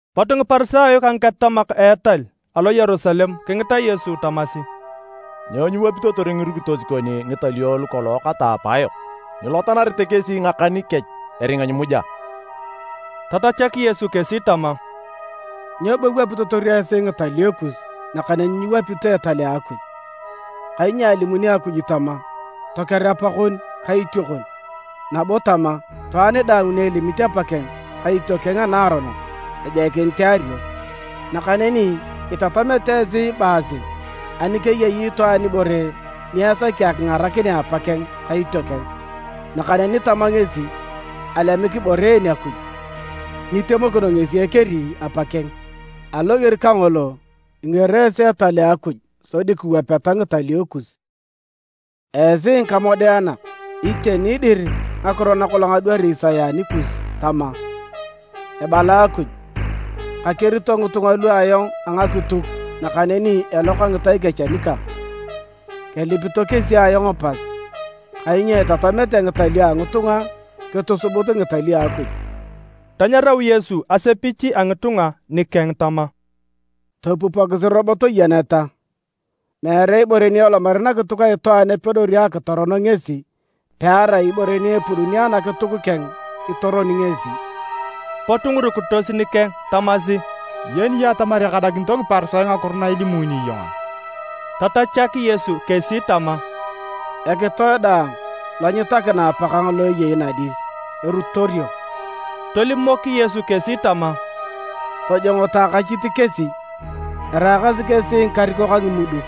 Pot Ngiparisayo ka ngiketatamak a etal alo Yerusalem kingita Yesu tamasi, “Nyo nyiwapitotor ngirukitos kon ngitalio lu kolong kata apaayok? Nyilotanarete kesi ngakan kech eringa nyimuja!” Tatachak Yesu kesi tama, “Nyo bo iwapitotor esi ngitalio kus nakaneni nyiwapito etal a Akuj? Kainyo alimuni Akuj tama, ‘Toker apakon ka itiokon,’ nabo tama, ‘Itwaan daang ni elimit apakeng ka itiokeng anaaronok, ejoikinit eario.’ Nakaneni itatamete esi ibaasi ani keyei itwaan ibore ni esaki akingarakinea apakeng ka itiokeng, nakaneni tama ngesi, ‘Alemik ibore en Akuj,’ nyitemokino ngesi ekeri apakeng. Aloger kangolo, ingero esi Etal a Akuj sodi kiwapeta ngitalio kus. Esi ngikamodeanak! Iteni dir, ngakiro nakolong adwari Isaya anikus tama, ‘Ebala Akuj, kakerito ngitunga lu ayong a ngakituk, nakaneni eloka ngitai kech anikang. Kelipito kesi ayong pas, kainyo itatamete ngitalio a ngitunga kitusubut ngitalio a Akuj.’” Tanyarau Yesu asepich a ngitunga nikeng tama, “Topupokisi nabo toyeneta! Meere ibore ni elomari nakituk a itwaan epedori akitoron ngesi, pearai ibore ni epuduni anakituk keng itoroni ngesi.” Pot ngirukitos nikeng tamasi, “Iyeni iyong atamar ekadakinito Ngiparisayo ngakiro na ilimuni iyong a?” Tatachak Yesu kesi tama, “Ekitoe daang lo nyitakina Apakang lo eyei nadis, erutorio.” Tolimok Yesu kesi tama, “Tojongoto akachit kesi! Eraakasi kesi ngikarikok a ngimuduk,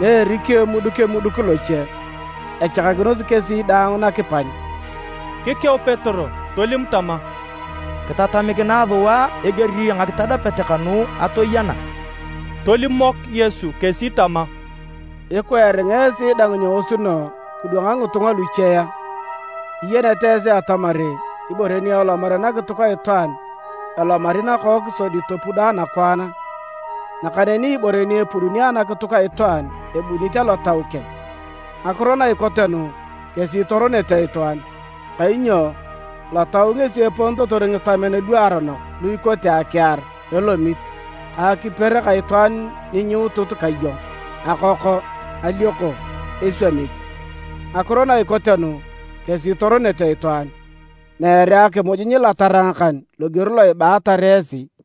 na erikio emuduk emuduk loche, echakakinosi kesi daang nakipany.” Kikeu Petero tolim tama, “Kitatamikinae sua eger a ngakitadapet kanu atoyena.” Tolimok Yesu kesi tama, “Ikwa eringa esi dang nyeosuno kidwanga ngitunga luche a? Nyiyenete esi atamar ibore ni elomari nakituk a itwaan elomari nakook sodi topudo anakwaan a? Nakaneni ibore ni epuduni anakituk a itwaan ebunit alotau keng. Ngakiro na ikote nu kesi itoronete itwaan. Kainyo lotau ngesi eponitotor ngitamen luaronok lu ikote akiar, elomit ka akiper ka itwaan ni nyiutut ka iyong, akoko, alioko, eswamit. Ngakiro na ikote nu kesi itoronete itwaan, meere akimuj nyilatara ngakan loger lo ibaatar esi.”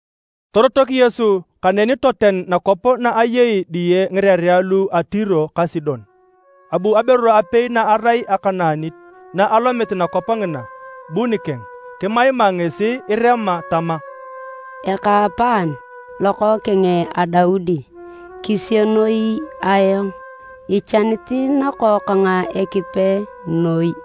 Torotok Yesu kaneni toten nakwap na eyei diye ngirerea lu a Tiro ka Sidon. Abu aberu apei na arai Akanaanit na alomit nakwap ngina bu nikeng. Kimaima ngesi irema tama, “Ekaapaan, Lokookeng a Daudi! Kisienoi ayong! Ichanit nakookang Ekipe noi.”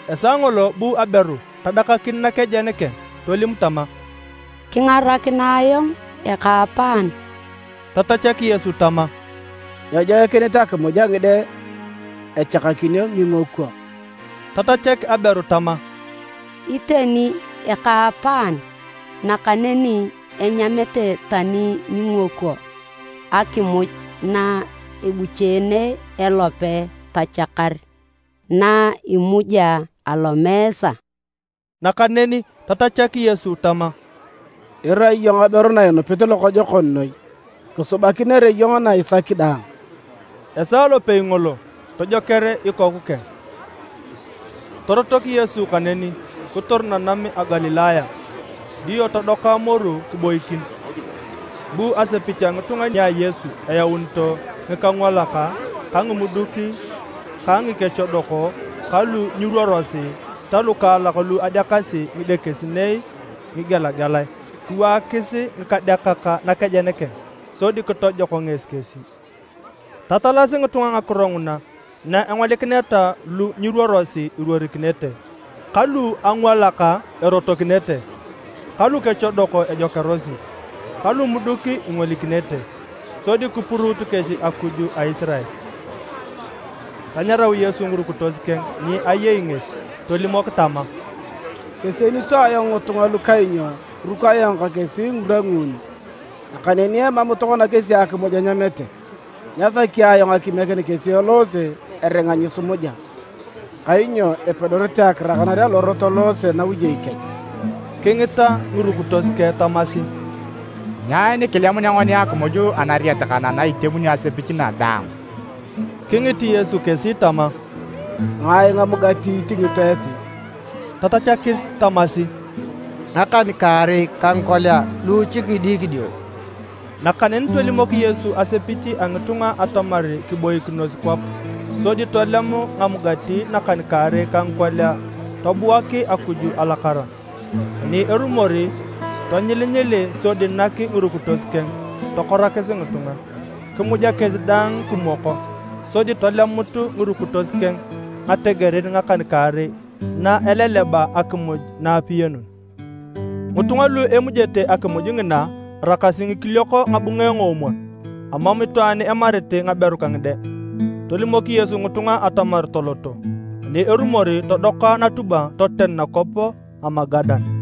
Esaa ngolo bu aberu tadakakin nakejen keng, tolim tama, “Kingarakinae ayong ekaapaan!” Tatachak Yesu tama, “Nyejoikinit akimuj a ngide echakakinio ngingokwo.” Tatachak aberu tama, “Iteni ekaapaan, nakaneni enyamete tani ngingokwo akimuj na ebucheene ilope tochakar na imuja alomeesa.” Nakaneni tatachak Yesu tama, “Irai iyong aberu na inupit lokojokon noi! Kisubakinere iyong na isaki daang.” Esaa lopei ngolo tojoker ikoku keng. Torotok Yesu kaneni, kitor nanam a Galilaya. Dio todoka moru kiboikin. Bu asepich a ngitunga nia Yesu eyaunito ngikangwalak ka ngimuduk ka ngikechodok ka lu nyiruorosi ta lukaalak lu adeakasi ngidekesinei ngigelagelae. Kiwaakis ngikadeakak nakejen keng sodi kitojok ngesi kesi. Tatalasi ngitunga ngakiro nguna na engolikineta lu nyiruorosi iruorikinete, ka lu angwalak erotokinete ka lukechodok ejokearosi, ka lumuduk ingolikinete, sodi kipuruut kesi Akuj a Isirael. Tanyarau Yesu ngirukitos keng ni ayei ngesi tolimok tama, “Kesienito ayong ngitunga lu kainyo kiruk ayong ka kesi ngirwa nguuni. Nakaneni emam tokona kesi akimuj enyamete. Nyasaki ayong akimiekin kesi eloose eringa nyisimuja, kainyo epedorete akirakanar alorot eloose nawiyei kech.” Kingita ngirukitos keng tamasi, “Nyai ni kilemunea ngoni akimuj anariet kana na itemuni asepich na daang?” Kingit Yesu kesi tama, “Ngai ngamugati itingito esi?” Tatachakis tamasi, “Ngakan-kaarei ka ngikolia luuchik ngidikidio.” Nakaneni tolimok Yesu asepich a ngitunga atamar kiboikinos kwap. Sodi tolem ngamugati nakan-kaarei ka ngikolia, tobuak Akuj alakara. Ani erumor tonyilinyili sodi nak ngirukitos keng tokorakis ngitunga. Kimuja kesi daang kimwoko. Sodi tolemut ngirukitos keng ngategerin ngakan-kaarei na eleleba akimuj na apiyanun. Ngitunga lu emujete akimuj ngina araakasi ngikiliok ngabunge ngoomwon, emam itwaan emarit ngaberu ka ngide. Tolimok Yesu ngitunga atamar toloto, ani erumor todoka natubwa toten nakwap a Magadan.